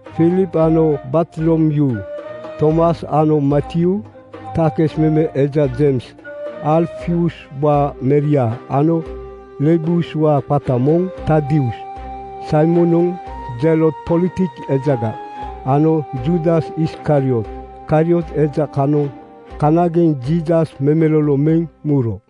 Filip ano Bartolomyuu, Tomas ano Matyuu takis meme eja, Jeims Alfiuswaa meria ano Lebeus qata moŋ Tadius, Saimon Zelot-politik ejaga ano Juudas Iskariot. Kariot eja kanoŋ kanageŋ Jiisas memelolo meŋ muro.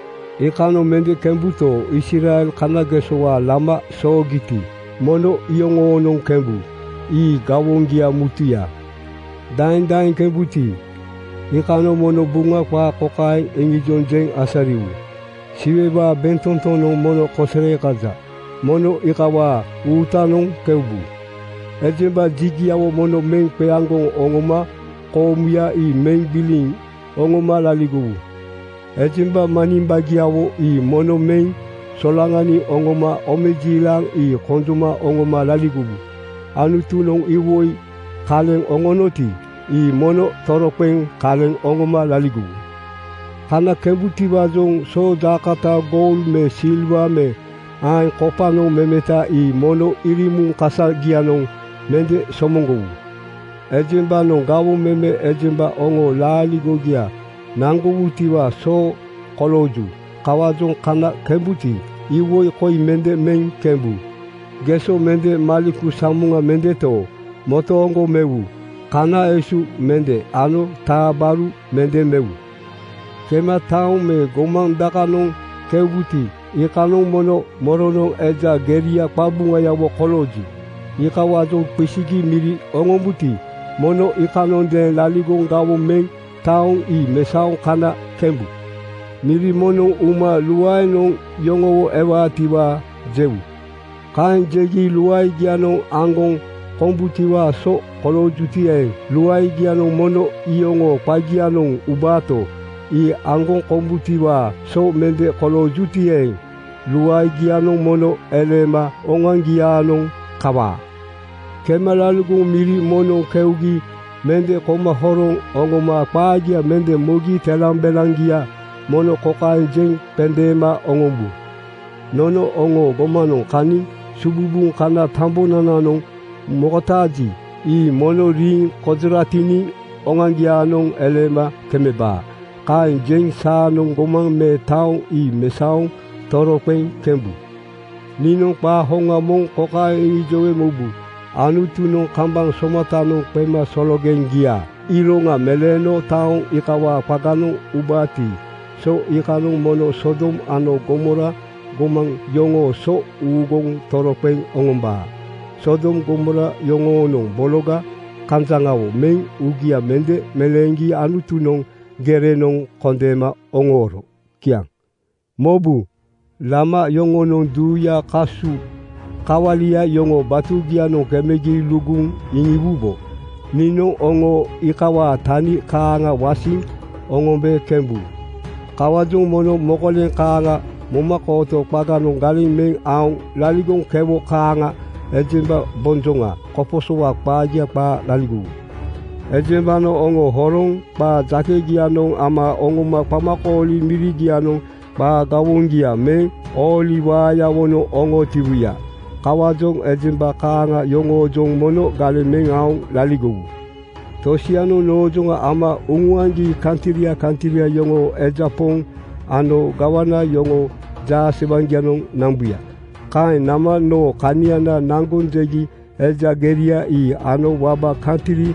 Iikanoŋ mende kembuto, Israel kanagesowaa lama soogiti, mono iyoŋoonoŋ kembu. Ii gawoŋgia mutuya. Daeŋ daeŋ kembuti, iikanoŋ mono Buŋa qaa kokaeŋ iŋijoŋ jeŋ asariwu, ‘Siwewaa bentotonoŋ mono kosere kaja. Mono iikawaa uutanoŋ keubu.’ “Ejemba jigiawo mono meŋ qeaŋgoŋ oŋoma koomuya ii meŋ gbiliŋ oŋoma laligowu. Ejemba manimbagiawo ii mono meŋ solaŋaniŋ oŋoma omejiilaŋ ii konjoma oŋoma laligowu. Anutunoŋ iwoi kaleŋ oŋonoti, ii mono toroqeŋ kaleŋ oŋoma laligowu. “Kana kembutiwaajoŋ soojaakota goul me silwa me aeŋ kopanoŋ memeta ii mono irimuŋ kasagianoŋ mende somoŋgowu. Ejembanoŋ gawoŋ meme ejemba oŋoo laaligogia naŋgowutiwaa so kolooju. Kawaajoŋ kana kembuti, iwoi koi mende meŋ kembu: geso mende, maleku samoŋa mendeto, motooŋgo mewu, kana esu mende ano taa gbaru mende mewu. “Kema taoŋ me gomaŋ dakanoŋ keubuti, iikanoŋ mono moronoŋ eja geria qabuŋayawo kolooji, iikawaajoŋ qisigi miri oŋombuti, mono iikanondeeŋ laligoŋ gawoŋ meŋ taoŋ ii mesaoŋ kana kembu. Miri moŋnoŋ uma luaenoŋ yoŋowo ewaatiwaa jewu. Kaeŋ jegi luaegia aŋgoŋ kombutiwaa so koloojuti eeŋ, luaegianoŋ mono iyoŋoo qagianoŋ ubaato, ii aŋgoŋ kombutiwaa so mende koloojuti eeŋ, luaegianoŋ mono eleema oŋoaŋgiaanoŋ kawaa. “Kema laligoŋ miri moŋnoŋ keugi mende koma horoŋ oŋoma qaagia mende mogi telambelaŋgia mono kokaeŋ jeŋ qendeema oŋombu, ‘Nono oŋoo gomanoŋ kaniŋ sububuŋ kana tambonananoŋ mokotaaji, ii mono riiŋ konjoratiniŋ oŋoaŋgiaanoŋ eleema kemebaa.’ Kaeŋ jeŋ saanoŋ gomaŋ me taoŋ ii mesaoŋ toroqeŋ kembu. Niinoŋ qaa hoŋa moŋ kokaeŋ iŋijowe mobu: Anutunoŋ kambaŋ somatanoŋ qemasologeŋgiaa iroŋa meleeno taoŋ iikawaa qaganoŋ ubaati, so iikanoŋ mono Sodom ano Gomora gomaŋ yoŋoo so uuguŋ toroqeŋ oŋombaa. (Sodom Gomora yoŋonoŋ bologa kanjaŋawo meŋ uugia mende meleeŋgi Anutunoŋ gerenoŋ kondeema oŋooro.) Kiaŋ. “Mobu, lama yoŋonoŋ duuyaa kasu kawalia yoŋoo batugianoŋ kemegi luguŋ iŋiwubo, niinoŋ oŋo iikawaa tani kaaŋa wasiŋ oŋombe kembu. Kawaajoŋ mono mokoleŋ kaaŋa momakooto qaganoŋ galeŋ meŋ aoŋ laligoŋ kewo kaaŋa ejemba bonjoŋa koposowaa qaagia qaa laligowu. Ejembanoŋ oŋo horoŋ qaa jakegianoŋ ama oŋoma qamakooli mirigianoŋ qaa gawoŋgia meŋ ooli waayawonoŋ oŋootiwuya. Kawaajoŋ ejemba kaaŋa yoŋoojoŋ mono galeŋ meŋ aoŋ laligowu. “Tosianoŋ noojoŋa ama uŋuaŋgi kantria kantria yoŋoo eja poŋ ano gawana yoŋoo jaasewaŋgianoŋ nambuya. Kaeŋ nama noo kaniana naŋgoŋ jegi eja geria ii ano waba kantri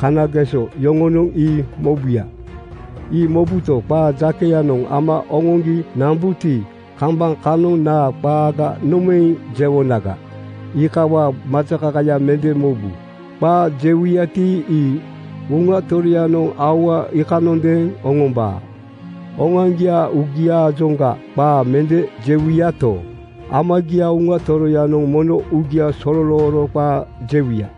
kanageso yoŋonoŋ ii mobuya. Ii mobuto, qaa jakeyanoŋ ama oŋoŋgi nambuti, kambaŋ kanoŋ naa qaaga nomaeŋ jewonaga, iikawaa majakaka mende mobu. Qaa jewuyati, ii Uŋa Toroyanoŋ aua iikanondeeŋ oŋombaa. Oŋoaŋgiaa uugiaajoŋga qaa mende jewuyato, Amagiaa Uŋa Toroyanoŋ mono uugia sololooro qaa jewuya.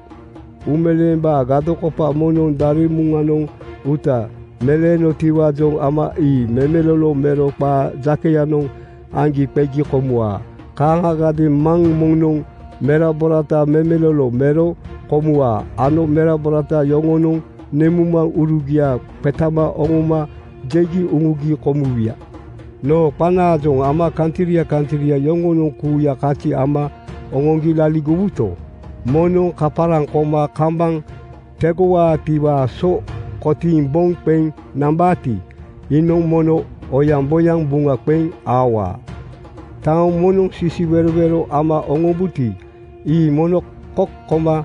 “Uumeleembaa gadokopa moŋnoŋ daremuŋanoŋ uuta meleenotiwaajoŋ ama ii memelolo mero qaa jakeyanoŋ aŋgi qegi komuwaa. Kaaŋagadeeŋ maŋ moŋnoŋ meraborata memelolo mero komuwaa ano merabora yoŋonoŋ nemuŋmaŋurugia qetama oŋoma jegi uŋugi komuwuya. Noo qanaajoŋ ama kantria kantria yoŋonoŋ kuuya kazi ama oŋoŋgi laligowuto, moŋnoŋ kaparaŋ koma kambaŋ tegowaatiwaa so kotiiŋ boŋ qeŋ nambaati, iinoŋ mono oyaŋboyaŋ buŋa qeŋ aowaa. “Taoŋ moŋnoŋ sisiwerowero ama oŋombuti, ii mono kok koma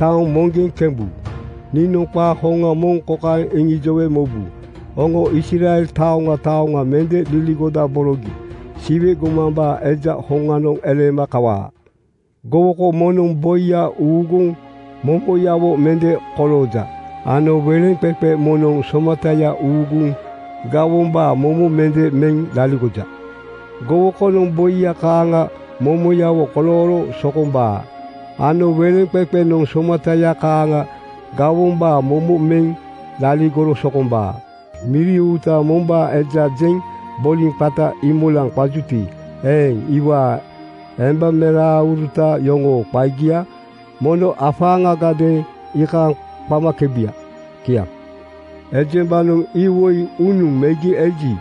taoŋ moŋgeŋ kembu. Niinoŋ qaa hoŋa moŋ kokaeŋ iŋijowe mobu: Oŋo Israel taoŋa taoŋa mende liligodaborogi Siwe gomambaa Eja hoŋanoŋ eleema kawaa. Gowoko moŋnoŋ boiya uuguŋ momoyawo mende kolooja ano weleŋqeqe moŋnoŋ somataya uuguŋ gawombaa momo mende meŋ laligoja. “Gowokonoŋ boiya kaaŋa momoyawo kolooro sokombaa ano weleŋqeqenoŋ somataya kaaŋa gawombaa momo meŋ laligoro sokombaa. Miri uuta mombaa eja jeŋ boliŋ qata Iimolaŋ qajuti eeŋ, iwaa embameraaŋuruta yoŋoo qagia mono afaaŋagadeeŋ iikaaŋ qamakebuya. Kiaŋ. “Ejembanoŋ iwoi unuŋ megi eji,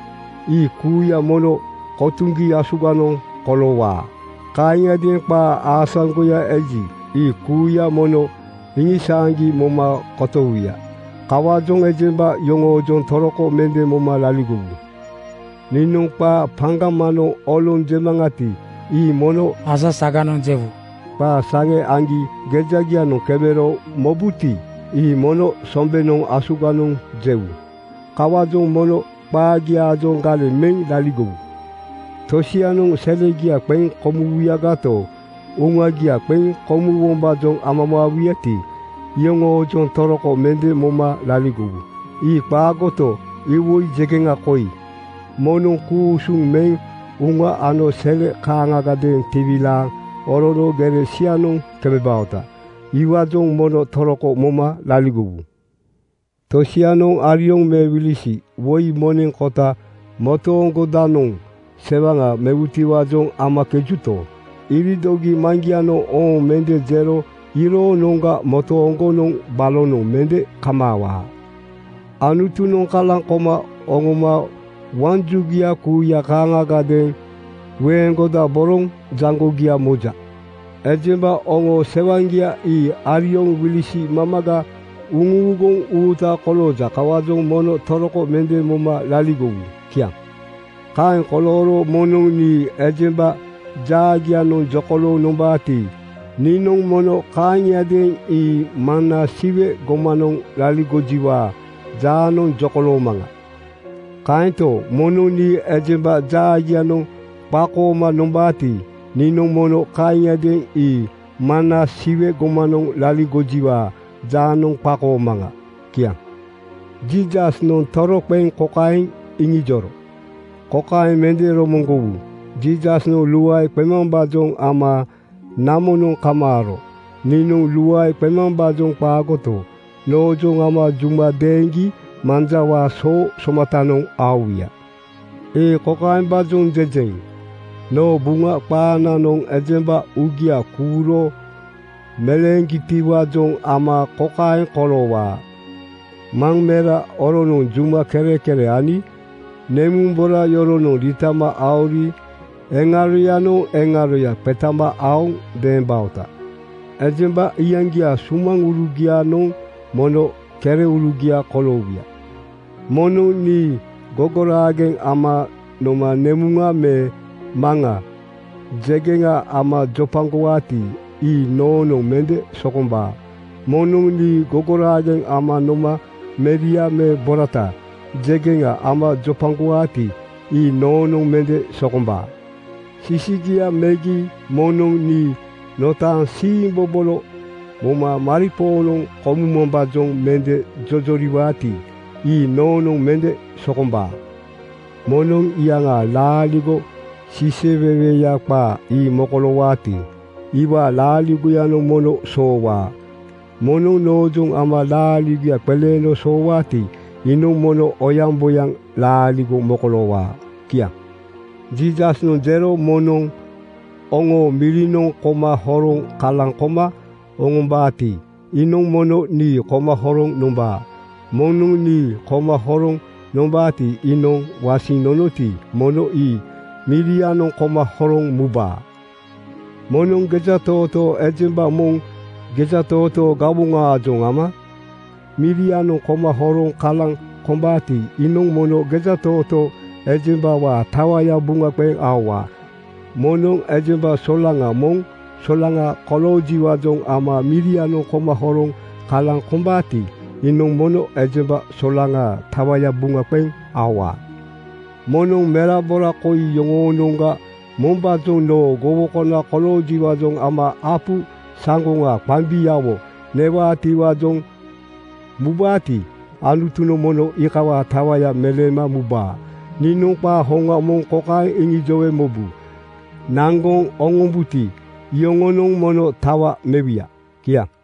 ii kuuya mono kotuŋgi asuganoŋ koloowaa. Kaaŋiadeeŋ qaa aasaŋgoya eji, ii kuuya mono iŋisaaŋgi moma kotowuya. Kawaajoŋ ejemba yoŋoojoŋ toroko mende moma laligowu. Niinoŋ qaa paŋgamanoŋ oloŋ jemaŋati, ii mono asasaganoŋ jewu. Qaa saŋe aŋgi gejagianoŋ kemero mobuti, ii mono sombenoŋ asuganoŋ jewu. Kawaajoŋ mono qaagiaajoŋ galeŋ meŋ laligowu. “Tosianoŋ selegia qeŋ komuwuyagato, uŋagia qeŋ komuwombaajoŋ amamaawuyati, iyoŋoojoŋ toroko mende moma laligowu. Ii qaagoto, iwoi jegeŋa koi: Moŋnoŋ ku-usuŋ meŋ uŋa ano sele kaaŋgadeeŋ tiwilaaŋ orono gere sianoŋ kemebaoti, iwaajoŋ mono toroko moma laligowu. Tosianoŋ arioŋ (me wilisi) woi moneŋ kota motooŋgodanoŋ sewaŋa mewutiwaajoŋ amakejuto, iridogi Maŋgianoŋ ‘Ooŋ!’ mende jero iyoroonoŋga motooŋgonoŋ balonoŋ mende kamaawaa. “Anutunoŋ kalaŋ koma oŋoma waŋ jugia kuuya kaaŋagadeeŋ weeŋgodaboroŋ jaŋgogia moja. Ejemba oŋoo sewaŋgia ii arioŋ wilisi mamaga uŋuuguŋ uuta kolooja. Kawaajoŋ mono toroko mende moma laligowu. Kiaŋ. “Kaeŋ kolooro moŋnoŋ nii ejemba jaagianoŋ jokolooŋ nombaati, niinoŋ mono kaaŋiadeeŋ ii Maŋna Siwe gomanoŋ laligojiwaa jaanoŋ jokoloomaŋa. Kaento, moŋnoŋ nii ejemba jaagianoŋ qakooma nombaati, niinoŋ mono kaaŋiadeeŋ ii Maŋna Siwe gomanoŋ laligojiwaa jaanoŋ qakoomaŋa.” Kiaŋ. Jiisasnoŋ toroqeŋ kokaeŋ iŋijoro, “Kokaeŋ mende romoŋgowu: Jiisasnoŋ luae qemambaajoŋ ama namonoŋ kamaaro. Niinoŋ luae qemambaajoŋ qaagoto, noojoŋ ama juma deeŋgi manjawaa soo somatanoŋ aowuya. “Ii kokaembaajoŋ jejeŋ: Noo Buŋa qaananoŋ ejemba uugia kuuro meleeŋgitiwaajoŋ ama kokaeŋ koloowaa: ‘Maŋ mera yoronoŋ juma kerekere ani nemuŋ bora yoronoŋ riitama aori eŋaronoŋ eŋaroya qetama aoŋ deembaota. Ejemba iyaŋgiaa sumaŋurugianoŋ mono kereurugia koloowuya.’ “Moŋnoŋ nii gogoraageŋ ama noma nemuŋa me maŋa jegeŋa ama jopagowaati, ii noonoŋ mende sokombaa. Moŋnoŋ nii gogoraageŋ ama noma meria me borata jegeŋa ama jopagowaati, ii noonoŋ mende sokombaa. Sisigia megi moŋnoŋ nii notaaŋ siimbobolo moma maripoonoŋ komumambaajoŋ mende jojoriwaati, ii noonoŋ mende sokombaa. “Moŋnoŋ iyaŋaa laaligo siiseweweya qaa ii mokoloowaati, iwaa laaligoyanoŋ mono soowaa. Moŋnoŋ noojoŋ ama laaligoya qeleeno soowaati, iinoŋ mono oyaŋboyaŋ laaligo mokoloowaa.” Kiaŋ. Jiisasnoŋ jero, “Moŋnoŋ oŋo mirianoŋ koma horoŋ kalaŋ koma oŋombaati, iinoŋ mono nii koma horoŋ nombaa. Moŋnoŋ nii koma horoŋ nombaati, iinoŋ wasiŋ nonoti, mono ii mirianoŋ koma horoŋ mubaa. Moŋnoŋ gejatootoo ejemba moŋ gejatootoo gawoŋaajoŋ ama mirianoŋ koma horoŋ kalaŋ kombaati, iinoŋ mono gejatootoo ejembawaa tawaya buŋa qeŋ aowaa. Moŋnoŋ ejemba solaŋa moŋ solaŋa koloojiwaajoŋ ama mirianoŋ koma horoŋ kalaŋ kombaati, iinoŋ mono ejemba solaŋaa tawaya buŋa qeŋ aowaa. “Moŋnoŋ merabora koi yoŋoonoŋga mombaajoŋ noo gowokona koloojiwaajoŋ ama apu saŋgoŋa qambiawo newaatiwaajoŋ mubaati, Anutunoŋ mono iikawaa tawaya meleema mubaa. Niinoŋ qaa hoŋa moŋ kokaeŋ iŋijowe mobu: Naŋgoŋ oŋombuti, iyoŋonoŋ mono tawa mewuya.” Kiaŋ.